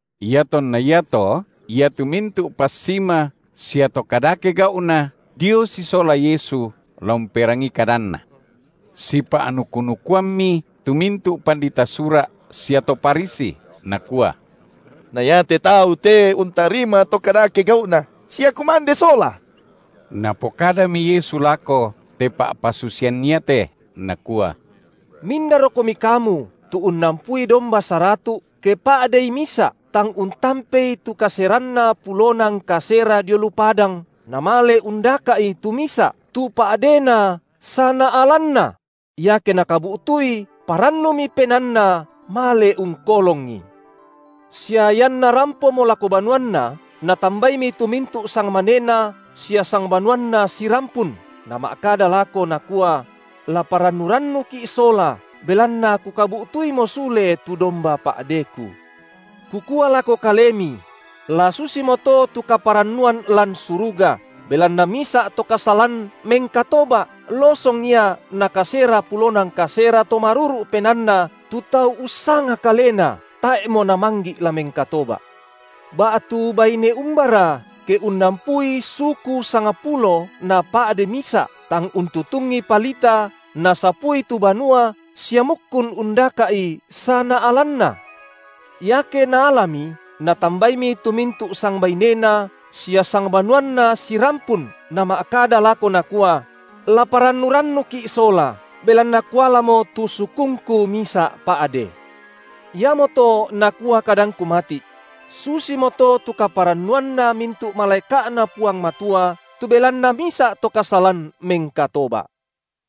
Iatonna iato iatu mintu’ passima sia to kadake gau’na dio sisola Yesu la umperangii kadanNa. Sipa’nuku-nukuammi tu mintu’ pandita Sura’ sia to Farisi, nakua: Na iate Tau te untarima to kadake gau’na, sia kumande sola. Napokadami Yesu lako te pa’pasusian iate, Nakua: Mindarokomi kamu tu unnampui domba saratu’, ke pa’dei misa’, tang untampei tu kaseranna pulona ngkasera dio lu padang, namale undaka’i tu misa’, tu pa’dena sanaalanna? Iake nakabu’tui, parannumi penaanna male ungkolongi. Sia ianna rampomo lako banuanna, natambaimi tu mintu’ sangmanena sia sangbanuanna sirampun, nama’kada lako, nakua: La parannu-rannuki’ sola, belanna kukabu’tuimo sule tu domba pa’deku. Kukua lako kalemi: La susimoto tu kaparannuan lan suruga, belanna misa’ to kasalan mengkatoba’ losong ia na kasera pulona ngkasera to maruru’ penaanna tu tau ussanga kalena tae’mo namanggi’ la mengkatoba’. Ba’tu baine umbara, ke unnampui suku sangpulo napa’de misa’, tang untutungi palita nasapui tu banua sia mukkun undaka’i sanaalanna? Iake naalami, natambaimi tu mintu’ sangbainena sia sangbanuanna sirampun nama’kada lako nakua: La parannu-rannuki’ sola, belanna kualamo tu sukungku misa’ pa’de. Iamoto nakua kadangKu mati’: Susimoto tu kaparannuanna mintu’ malaeka’Na Puang Matua tu belanna misa’ to kasalan mengkatoba’.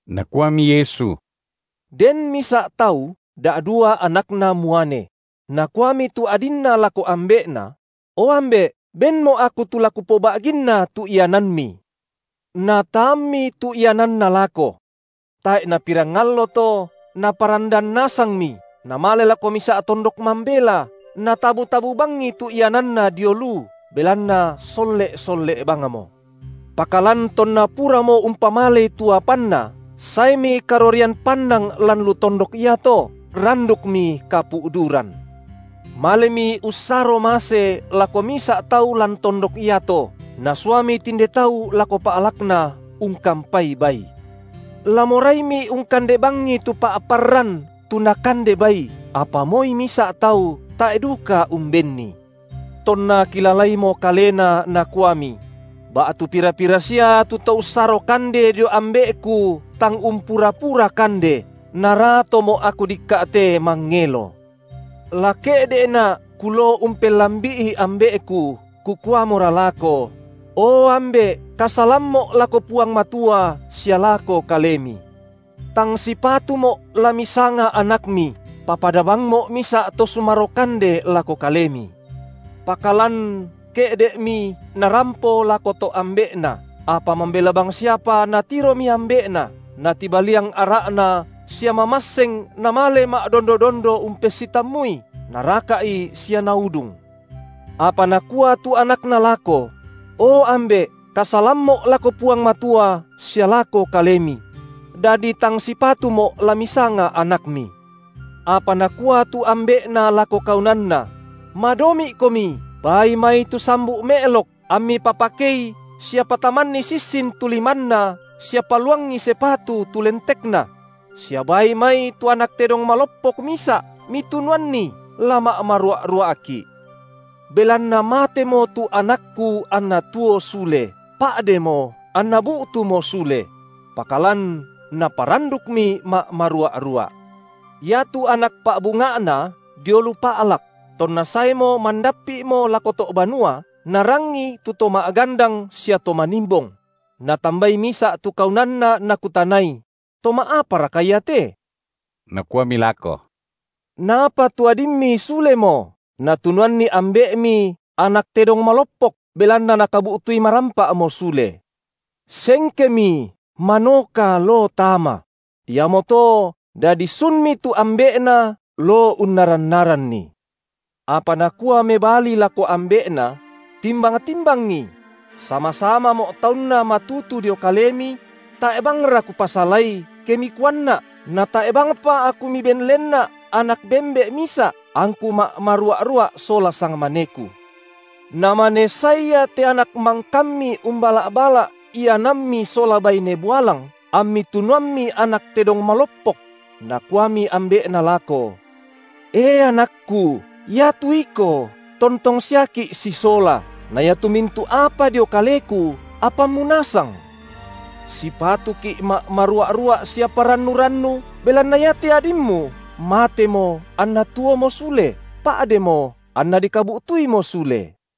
Nakuami Yesu: Den misa’ tau da’dua anakna muane. Nakuami tu adinna lako ambe’na: O ambe’, benmo’ aku tu la kupoba’ginna tu iananmi. Nataammi tu iananna lako. Tae’ napirang allo to, naparandan nasangmi, namale lako misa’ tondok mambela, natabu-tabu bangi tu iananna dio lu, belanna solle’-solle’ bangmo. Pakalan tonna puramo umpamalei tu apanna, saemi karorian pannang lan lu tondok iato, randukmi kapu’duran. Malemi ussaro mase lako misa’ tau lan tondok iato, nasuami tinde tau lako pa’lakna ungkampai bai. La moraimi ungkande bangi tu pa’parran, tu nakande bai, apa moi misa’ tau tae’ duka umbenni. Tonna kilalaimo kalena, nakuami: Ba’tu pira-pira sia tu to ussaro kande dio ambe’ku tang umpura-pura kande, na ratomo’ aku dikka’ te mangelo. La ke’de’na’ kuloo umpellambi’i ambe’ku, kukuamora lako: O ambe’, kasalammo’ lako Puang Matua sia lako kalemi. Tang sipatumo’ la misanga anakmi, papada bangmo’ misa’ to sumaro kande lako kalemi. Pakalan ke’de’mi narampo lako to’ ambe’na, apa mambela bangsiapa natiromi ambe’na, natibaliang ara’na sia mamasseng namale ma’dondo-dondo umpessitammui, naraka’i sia naudung. Apa nakua tu anakna lako: O ambe’ kasalammo’ lako Puang Matua sia lako kalemi; dadi tang sipatumo’ la misanga anakmi. Apa nakua tu ambe’na lako kaunanna: Madomi’komi baai mai tu sambu’ me’lok, ammi papakei sia patamanni sissin tu limanna sia paluangi sepatu tu lentekna; sia baai mai tu anak tedong maloppok misa’, mitunuanni, la ma’marua’-rua’ki’. Belanna matemo tu anakku anna tuo sule, pa’demo anna bu’tumo sule. Pakalan naparandukmi ma’marua’-rua’. Iatu anak pa’bunga’na dio lu pa’lak; tonna saemo mandappi’mo lako to’ banua narangii tu to ma’gandang sia to manimbong; natambai misa’ tu kaunanna nakutanai: To ma’aparaka ia te? Nakuami lako: Napa tu adimmi sulemo, natunuanni ambe’mi anak tedong maloppok, belanna nakabu’tui marampa’mo sule. Sengkemi, manoka loo tama; iamoto dadi sunmi tu ambe’na loo unnaran-naranni. Apa nakua mebali lako ambe’na: Timbang-timbangi; sama-samamo’ taunna matutu dio kalemi; tae’ bangra kupasalai, ke mikuanna’, natae’ bangpa aku miben lenna’ anak bembe’ misa’, angku ma’marua’-rua’ sola sangmaneku. Namane sae ia te anak mangkammi umbala’-bala’ iananmi sola baine bualang, ammi tunuammi anak tedong maloppok! Nakuami ambe’na lako: E anakku, iatu iko tontong siaki’ sisola, na iatu mintu’ apa dio kaleku apammu nasang. Sipatuki’ ma’marua’-rua’ sia parannu-rannu, belanna iate adimmu matemo anna tuomo sule, pa’demo anna dikabu’tuimo sule.